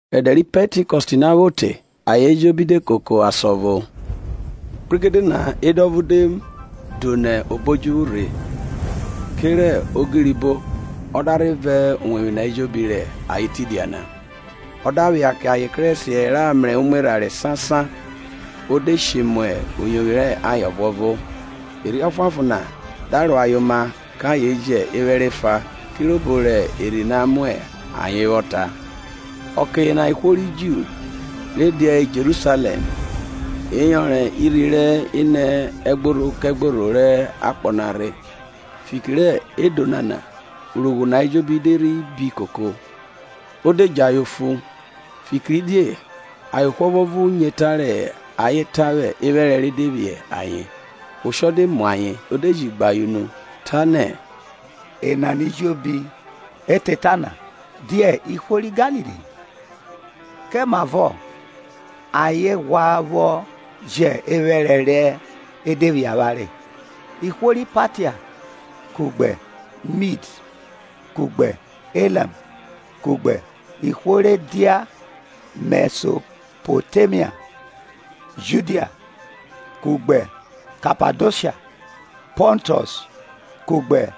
Rẹ ẹdẹ ri Pẹntikọst na vwo te, ayen ejobi de koko asan ọvo. Kpregede na edo ọvo de do nẹ obo odjuvwu rhe kerẹ ogirobo ọ da rhe vọn uwevwi na ejobi rẹ ayen tidia na. Ọ da phia kẹ ayen kerẹsiẹ ra mrẹ imwerhanre sansan, o de she mu uyovwi rẹ ayen ọvuọvo. Erhi Ọfuanfon na da ro ayen oma kẹ ayen jẹ ephẹrẹ efa, kirobo rẹ Erhi na mu ayen vwọ ta. Ọke yena ihwo ri Ju re dia Jerusalẹm, ẹyọnrọn irhi ri nẹ ẹgborho kẹgborho rẹ akpọ na rhe. Fiki rẹ edo nana urogho na ejobi de rhi bi koko, o de gbe ayen unu, fikiridie ayen ohwo ọvuọvo nyo eta rẹ ayen ta vwẹ ephẹrẹ re de vwiẹ ayen. Oshọ de mu ayen o de ji gbe ayen unu, ta nẹ, Enana ejobi re ta eta na dia ihwo ri Galili? Kemavọ ayen ghwa vwọ jẹ ephẹrẹ re de vwiẹ avwanre? Ihwo ri Patia kugbe Mid kugbe Elam kugbe ihwo re dia Mẹsopotemia, Judia kugbe Kapadosha, Pọntus kugbe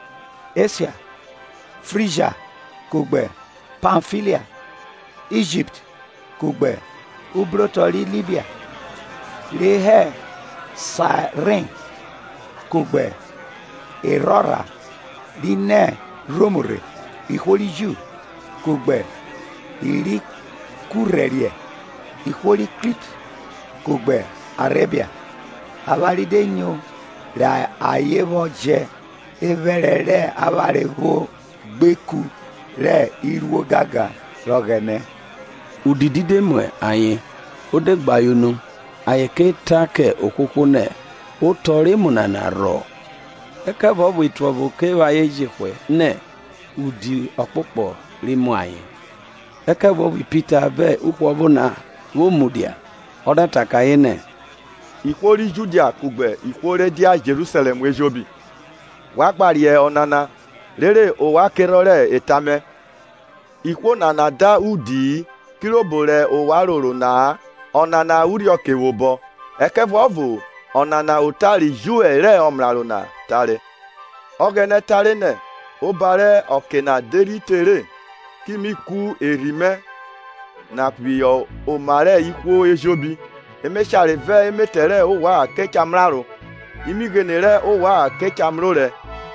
Esha. Frigia kugbe Pamfilia, Ijipt kugbe ubrotọ ri Libia re hẹ Saeren, kugbe erhorha ri nẹ Rom rhe, ihwo rẹ Ju kugbe i ri kurhẹriẹ. Ihwo ri Krit kugbe Arebia, avwanre de nyo rẹ ayen vwọ jẹ ephẹrẹ rẹ avwanre vwo gbe ikun rẹ iruo egangan rẹ Ọghẹnẹ. Udidi de mu ayen o de gbe ayen unu, ayen ke ta kẹ ohwohwo nẹ otọ rẹ emu nana rhọ? Ẹkẹvuọvo otuẹvo ke vwẹ ayen jehwẹ nẹ, udi ọkpokpọ ri mu ayen. Ẹkẹvuọvo Pita, vẹ uhwọvo na vwo mudia, ọ da ta kẹ ayen nẹ, ihwo ri Judia kugbe ihwo re dia Jerusalẹm ejobi, wa gba riẹn ọnana, rere ovwan kerhọn rẹ eta mẹ. Ihwo nana da udi-i, kirobo rẹ ovwan roro na ọnana irhioke vwobọ; ẹkẹvuọvo ọnana ota ri Joẹl rẹ ọmraro na tare. Ọghẹnẹ tare nẹ, oba rẹ ọke na de rhi tere ki mi ku Erhi mẹ na phihọ oma rẹ ihwo ejobi, emeshare vẹ emetẹ rẹ ovwan ke cha mraro, imighene rẹ ovwan ke cha mrorẹ,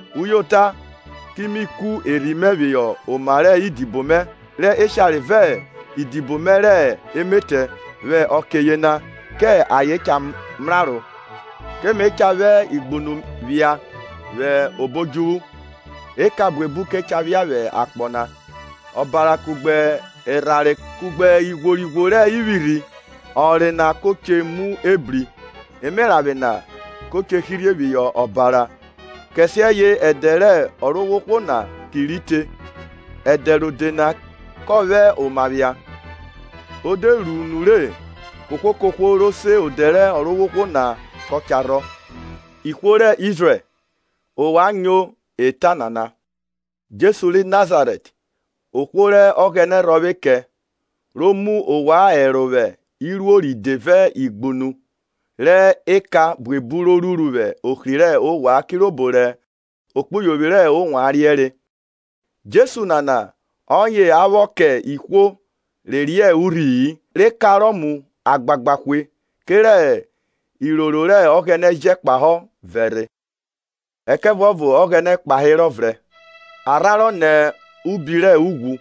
uyota, ki mi ku Erhi mẹ phihọ oma rẹ idibo mẹ rẹ eshare vẹ idibo me rẹ emetẹ vwẹ ọke yena; kẹ ayen cha mraro. Ke me cha vwẹ igbunu phia vwẹ obo odjuvwu eka buebu ke cha phia vwẹ akpọ na, ọbara, kugbe erhanre, kugbe ighworighwo rẹ ivwirhi; ọnre na ko che mu ebri emeranvwe na ko che hirhe phihọ ọbara, kẹsiẹye ẹdẹ rẹ Ọrovwohwo na ki rhi te, ẹdẹ rode na kọ vwẹ oma phia. O de ru nure kohwo kohwo ro se odẹ rẹ Ọrovwohwo na kọ cha rhọ. Ihwo rẹ Izrẹl, Ovwan nyo eta nana: Jesu ri Nazarẹt, ohwo rẹ Ọghẹnẹ rhọvwe kẹ ro ji mu ovwan ẹro vwẹ iruo ride vẹ igbunu rẹ eka buebu ro ruru vwẹ ohri rẹ ovwan kirobo rẹ ekpuyovwi rẹ ovwan riẹnre. Jesu nana, ọye a vwọ kẹ ihwo re riẹn urhi-i re kanrọ mu agbagba hwe, kerẹ iroro rẹ Ọghẹnẹ jẹ kpahọ vẹrhe. Ẹkẹvuọvo Ọghẹnẹ kpaerọ vrẹn, a rhanrọ nẹ obi rẹ ughwu,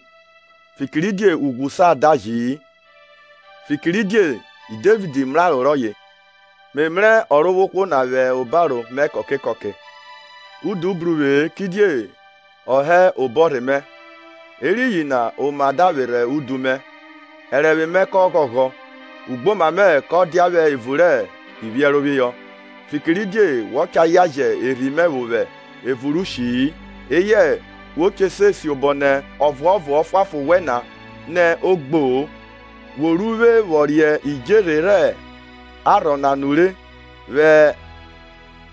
fikiridie ughwu sa daji-i. Fikiridie Devid mraro rọye, Me mrẹ Ọrovwohwo na vwẹ obaro mẹ vwẹ ọke ejobi, udu bru vwe-e kidie ọ hẹ obọrhe mẹ; eriyin na oma da vwerhe udu mẹ, ẹrẹnvwe mẹ da ghọghọ; ugboma mẹ kọ dia vwẹ evun rẹ iphiẹrohọ. Fikiridie wọ cha yan jẹn erhi mẹ vwo vwẹ evun rẹ ushi-i, eyẹ wo che se siobo nẹ Ọvuọvo Ọfuanfon wẹn na nẹ o gbo-o. Wo ru uvwe vwọ riẹn idjerhe rẹ arhọ na nure; vwẹ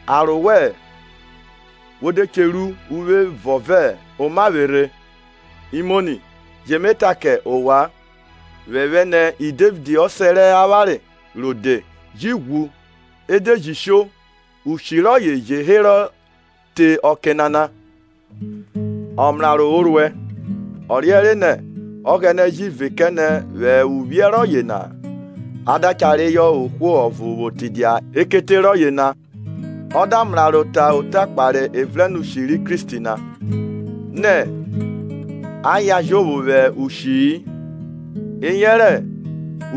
aro wẹ wo de che ru uvwe vọn vẹ omavwerhovwẹ. Imoni, ju vwe ta kẹ ovwan phephẹ nẹ Devid osẹ rẹ avwanre rode ji ghwu ede ji sho, ushi rọye je herọ te ọke nana. Ọmraro o ruẹ, ọ riẹnre nẹ. Ọghẹnẹ ji vẹ kẹ nẹ vwẹ uvwiẹ rọye na a da cha reyọ ohwo ọvo vwo tidia ekete rọye na. Ọ da mraro ta ota kpahe evrẹnushi ri Kristi na, nẹ a yan jovwo vwẹ ushi-i, eyẹrẹ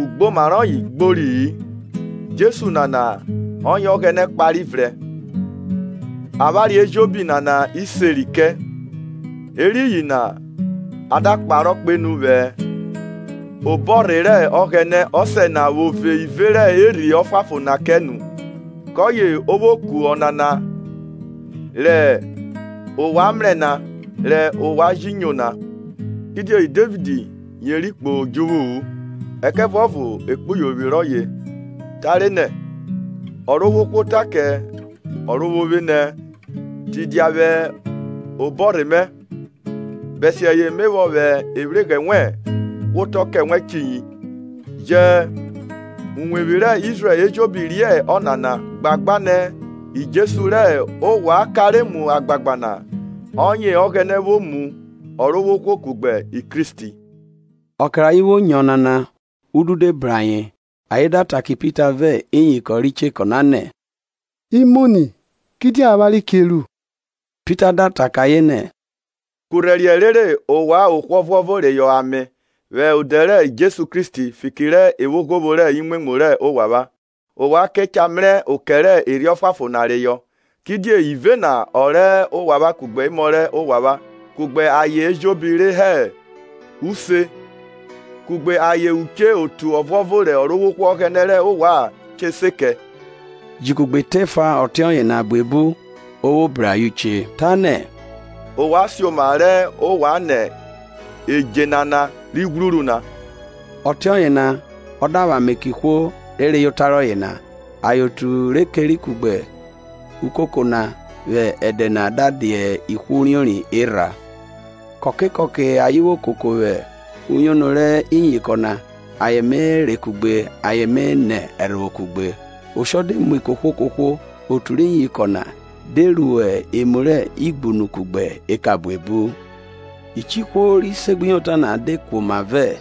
ugboma rọye gbori-i. Jesu nana ọye Ọghẹnẹ kpare vrẹn, avwanre ejobi nana iseri kẹ. Eriyin na a da kparọ kpenu vwẹ obọrhe rẹ Ọghẹnẹ Ọsẹ na ro ji ru ive rẹ Erhi Ọfuanfon na kẹ, kọye o ji kuẹ avwanre rẹ ovwan mrẹ na re ovwan ji nyo na. Kidie Devid yeri kpo idjuvwu-u; ẹkẹvuọvo ekpuyovwi rọye tare nẹ, Ọrovwohwo ta kẹ Ọrovwovwe nẹ, tidia vwẹ obọrhe mẹ, bẹsiẹye me vwọ vwẹ ivwighrẹ wẹn hwaọtọ kẹ wẹ chiyi. Jẹ uwevwi rẹ Izrẹl ejobi riẹn ọnana gbagba nẹ Jesu rẹ ovwan kanre mu agbagba na, ọye Ọghẹnẹ vwo mu Ọrovwohwo kugbe Kristi. Ọke rẹ ayen vwo nyo onana udu de bru ayen, ayen da ta kẹ Pita vẹ iyinkọn ri chekọ na nẹ, Imoni, Kidie avwanre che ru? Pita da ta kẹ ayen nẹ, Kurhẹriẹ rere ovwan ohwo ọvuọvo reyọ ame vwẹ odẹ ri Jesu Kristi fiki rẹ evwoghovwo rẹ imwemwu rẹ ovwan; ovwan ke cha mrẹ okẹ rẹ Erhi Ọfuanfon na reyọ. Kidie ive na ọ rẹ ovwan kugbe emọ rẹ ovwan kugbe ayen ejobi re hẹ isi, kugbe ayen uche otu ọvuọvo rẹ Ọrovwohwo Ọghẹnẹ rẹ avwanre che se vwọ kẹ. Ji kugbe eta efa ọtiọye na buebu o vwo bru ayen uche, tanẹ, ovwan sioma rẹ ovwan nẹ edje nana ri ghwruru na. Ọtiọye na a da vwẹ ame kẹ ihwo re reyọ ota rọye na, ayen otu re keri kugbe ukoko na vwẹ ẹdẹ yena na da dia ihwo uriori erha. Kọke kọke ayen vwo koko vwẹ uyono rẹ iyinkọn na ayen me re kugbe ayen me nẹ ẹrhovwo kugbe. Oshọ de mu kohwo kohwo; otu rẹ iyinkọn na de ru emu rẹ igbunu kugbe eka buebu. Uche ihwo ri segbuyota na de kuoma vẹ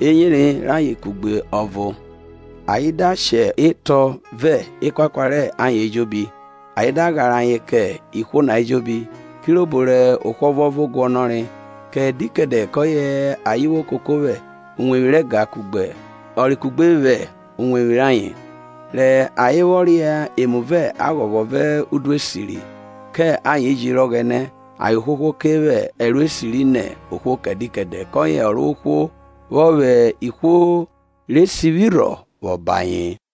eyere rayen kugbe ọvo. Ayen da shẹ etọ vẹ ekuakua rẹ ayen ejobi, ayen da ghare ayen kẹ ihwo na ejobi, kirobo rẹ ohwo ọvuọvo guọnọre. Kẹdẹ kẹdẹ kọye ayen vwo koko vwẹ uwevwi rẹ ega kugbe ọre kugbe vwẹ iwevwi rayen, re ayen vwọ ria emu vẹ aghọghọ vẹ udu esiri. Kẹ ayen jiri Ọghẹnẹ ayen ohwohwo ke vwẹ ẹro esiri ni ohwo. Kẹdẹ kẹdẹ kọye Ọrovwohwo vwọ vwẹ ihwo re sivwi rhọ vwọ ba ayen.